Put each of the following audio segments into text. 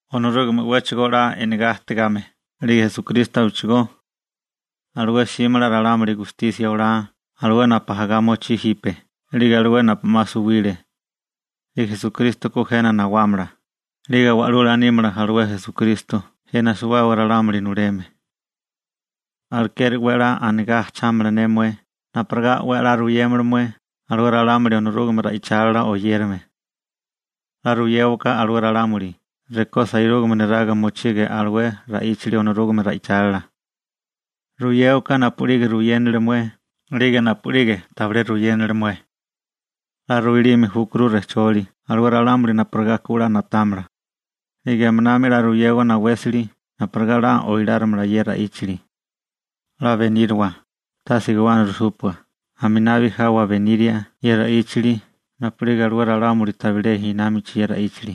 Onorúgame 'wéchigo 'la e'negá ajtigame 'lige Esukristo abechigó. Alué 'símala ralámuli gustisia olá alué napu ajagá mochí jipe 'lige alué napu 'ma suwile. 'Lige Esukristo ku jena nawámala, 'lige Wa'lula nímala alué Esukristo jena suwábaga ralámuli nuleme. Alekeri 'we 'la anigá ajchámala ne mué napurigá 'we 'la ruyémala mué alué ralámuli Onorúgame ra'ichálila oyérame. 'La ruyéwaká alué ralámuli rekó sairúgame neraga mochige alué ra'íchali Onorúgame ra'ichálila. Ruyéwaká napu'lige ruyénili mué 'lige napu'lige tabilé ruyénili mué. 'La ruilime júkuru rejcholi alué ralámuli napurigá ku 'la na'támala. 'Lige aminami 'la ruyewa nawésali napurigá 'la oilárimala ye ra'íchali. 'La beníriwa, tase guwana rujsúpua aminabi jawa beníria ye ra'íchali napu'lige alué ralámuli tabilé námachi ye ra'íchali.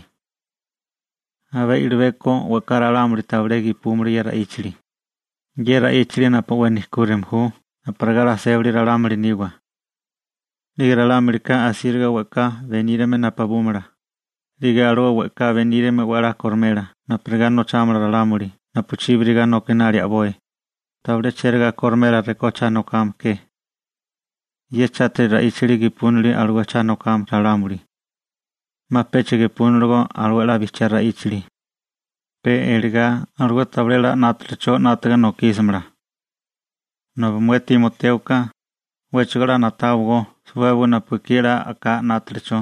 Abé i'libeko we'ká ralámuli tabilé gepúmala ye ra'íchali, ye ra'íchali napu 'we nejkúrime ju napurigá 'la sébali ralámuli niwa. 'Lige ralámulika asíriga we'ká benírime napubúmala, 'lige alué we'ká benírime 'we 'la korimela napurigá nochámala ralámuli napuchíbiriga nokinali a'boi, tabilé chérigá korimela rekó cha nokame ke. Ye chátiri ra'íchali gepúnili alué cha nokame ralámuli. 'Ma pecha gepúniligó alué 'la bijchiá ra'íchali. Pe eligá alué tabilé 'la 'nátalicho 'nátiga nokísimala. Nobi mué Timotéoka, 'wéchigo 'la na'táwagó suwábaga napu ekí 'la a'ká 'nátalicho,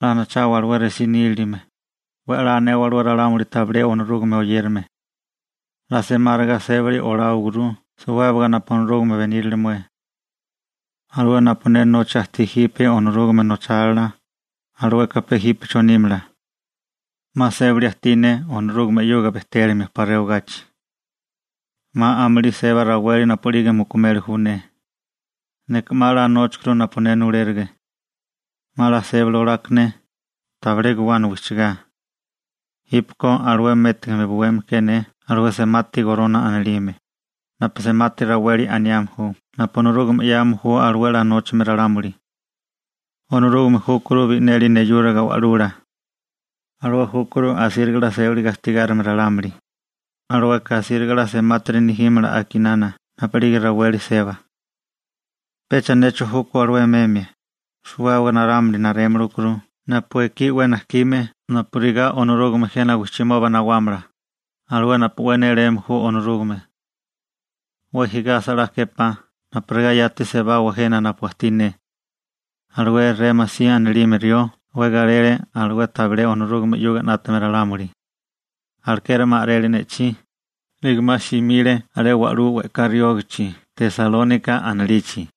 'la anachawa alué resí nílilime, 'we 'la anewa alué ralámuli tabilé Onorúgame oyérame. 'La semáriga sébili oláwaguru suwábaga napu Onorúgame benírale mué. Alué napu ne nocha ajtí jipe Onorúgame nochálila, alueka pe jípecho nímala. 'Ma sébali ajtí ne Onorúgame 'yuga bejtélimia 'pa rewagachi. 'Ma amulí seba raweli napu'lige mukumeli ju ne. Neka 'ma 'la nóchakuru napu ne nulérige. 'Ma 'la sébali olaka ne, tabilé guwana wijchigá. Jípeko alué métigame buwémala ke ne alué semati gorona anilime, napu semati raweli aniame ju napu Onorúgame 'yame ju alué 'la nóchame ralámuli. Onorúgame júkuru bi'neli neyúriga Wa'lula. Alué júkuru asíriga 'la sébali gastigárime ralámuli, alueka asíriga 'la semátiri nejímala a'kinana napu'lige raweli seba. Pecha necho júkó alué meme, suwábaga ralámuli narémili júkuru napu ekí 'we najkime napurigá Onorúgame jena wijchimoba nawámala, alué napu 'we néléme ju Onorúgame (Esukristo). 'We jigasa 'la képá napurigá yati sebawa jena napu ajtí ne. Alué Rémasi anilime rió 'we galele alué tabilé Onorúgame 'yuga 'nátame ralámuli. Alekeri 'ma a'rele ne'chí, 'lige 'ma simile alé wa'lú we'ká riógichi Tesalónika anilichi.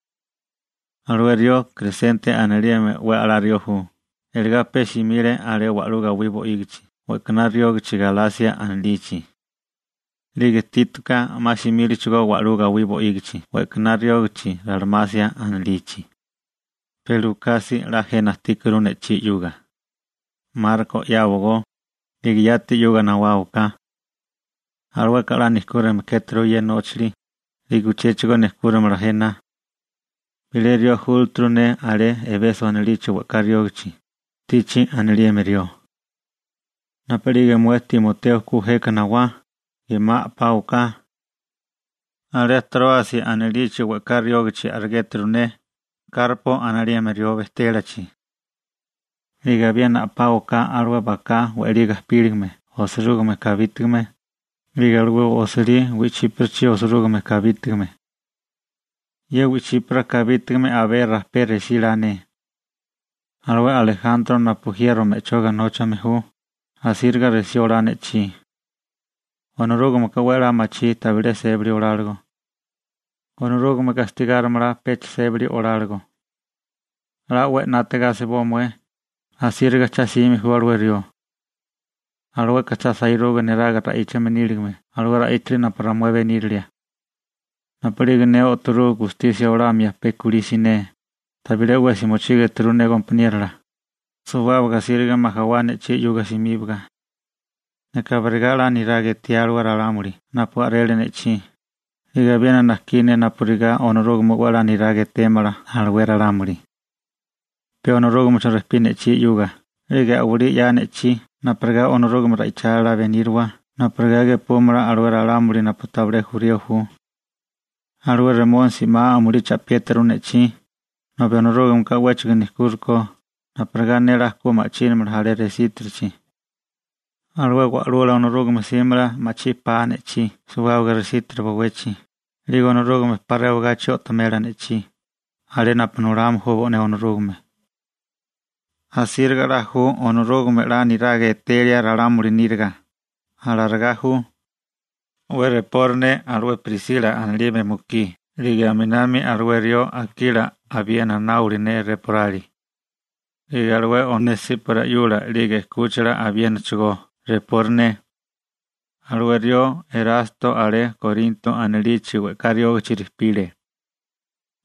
Alué rió Kresente anilime 'we 'la rió ju, eligá pe simile alé wa'lú gawí bo'ígichi we'kaná riógachi Galasia anilichi. 'Lige Títoka 'ma simílechigo wa'lú gawí bo'ígichi we'kaná riógachi Ralmasia anilichi. Pe Lukasi 'la jena ajtíkuru ne'chí 'yuga. Marko 'yáwagó, 'lige yati 'yuga nawáwaká. Alueka 'la nejkúrime kéturu ye nóchali, 'lige uchéchigo nejkúrimala jena. Bilé rió júlaturu ne alé Ebeso anilichi we'ká riógachi, Tichi anilime rió. Napu'lige mué Timoteo ku jeka nawá, gemá a'páwaká. Alé Tróasi anilichi we'ká riógichi a'rigéturu ne Karpo anilime rió bejtélachi. 'Lige abiena a'páwaká alué baká we'lí gapílame osirúgime kabítigame, 'lige alué osilí wi'chíparachi osirúgime kabítigame. Ye wi'chípara kabítigame abé rajpé resí la ne. Alué Alejantro napu jiero me'choga nóchame ju, asíriga resí olá ne'chí. Onorúgameka 'we 'la machí tabilé sébali oláligo. Onorúgame gastigárimala pecha sébali oláligo. 'La 'we 'nátiga asiboa mué, asíriga cha'sime ju alué rió. Alueka cha sairuga neraga ra'íchame níligame alué ra'íchali napu ramué benírilia. Napu'lige ne o'torú gustisia olamia pe kulí siné, tabilé 'wesi mochígeturu ne gompaniérola, suwábaga asíriga majawá ne'chí 'yuga simíbiga. Neka abirigá 'la niraga etiá alué ralámuli napu a'rele ne'chí, 'lige abiena najkí ne napurigá Onorúgame 'we 'la niraga etémala alué ralámuli. Pe Onorúgamecho rejpí ne'chí 'yuga 'lige a'walí 'ya ne'chí napurigá Onorúgame ra'ichálila beníriwa napurigá gepúmala alué ralámuli napu tabilé jurío ju. Alué Remónisi 'ma amulí cha'piéturu ne'chí, nobi Onorúgameka 'wéchigo nejkúrikó napurigá ne 'la ku ma'chínamala alé resítirichi. Alué Wa'lula Onorúgame 'símala ma'chí pa ne'chí suwábaga resítiri bowechi, 'lige Onorúgame 'pa rewagachi o'tomela ne'chí, alé napu nulame ju bo'né Onorúgame. Asíriga 'la ju Onorúgame 'la niraga etelia ralámuli níriga. Alarigá ju. 'We repori ne alué Prisila anilime mukí 'lige aminami alué rió Akila abiena náwala ne reporali. 'Lige alué Onesípora 'yula 'lige 'kúchila abiénachigó repori ne. Alué rió Erasto alé Korinto anilichi we'ká riógichi rejpile.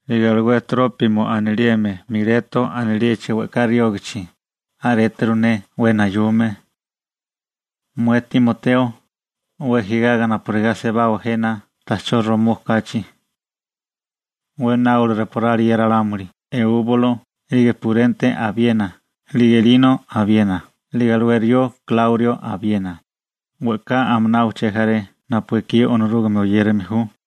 'Lige alué Trópimo anilime Mileto anilichi we'ká riógichi a'réturu ne 'we nayume. Mué Timoteo, 'we jigaga napurigá sebawa jena ta'chó romó kachi. 'We náola reporali ye ralámuli Eúbulo, 'lige Purente abiena, 'lige Lino abiena, 'lige alué rió Kláurio abiena, we'ká aminá uché jaré napu ekí Onorúgame oyérame ju.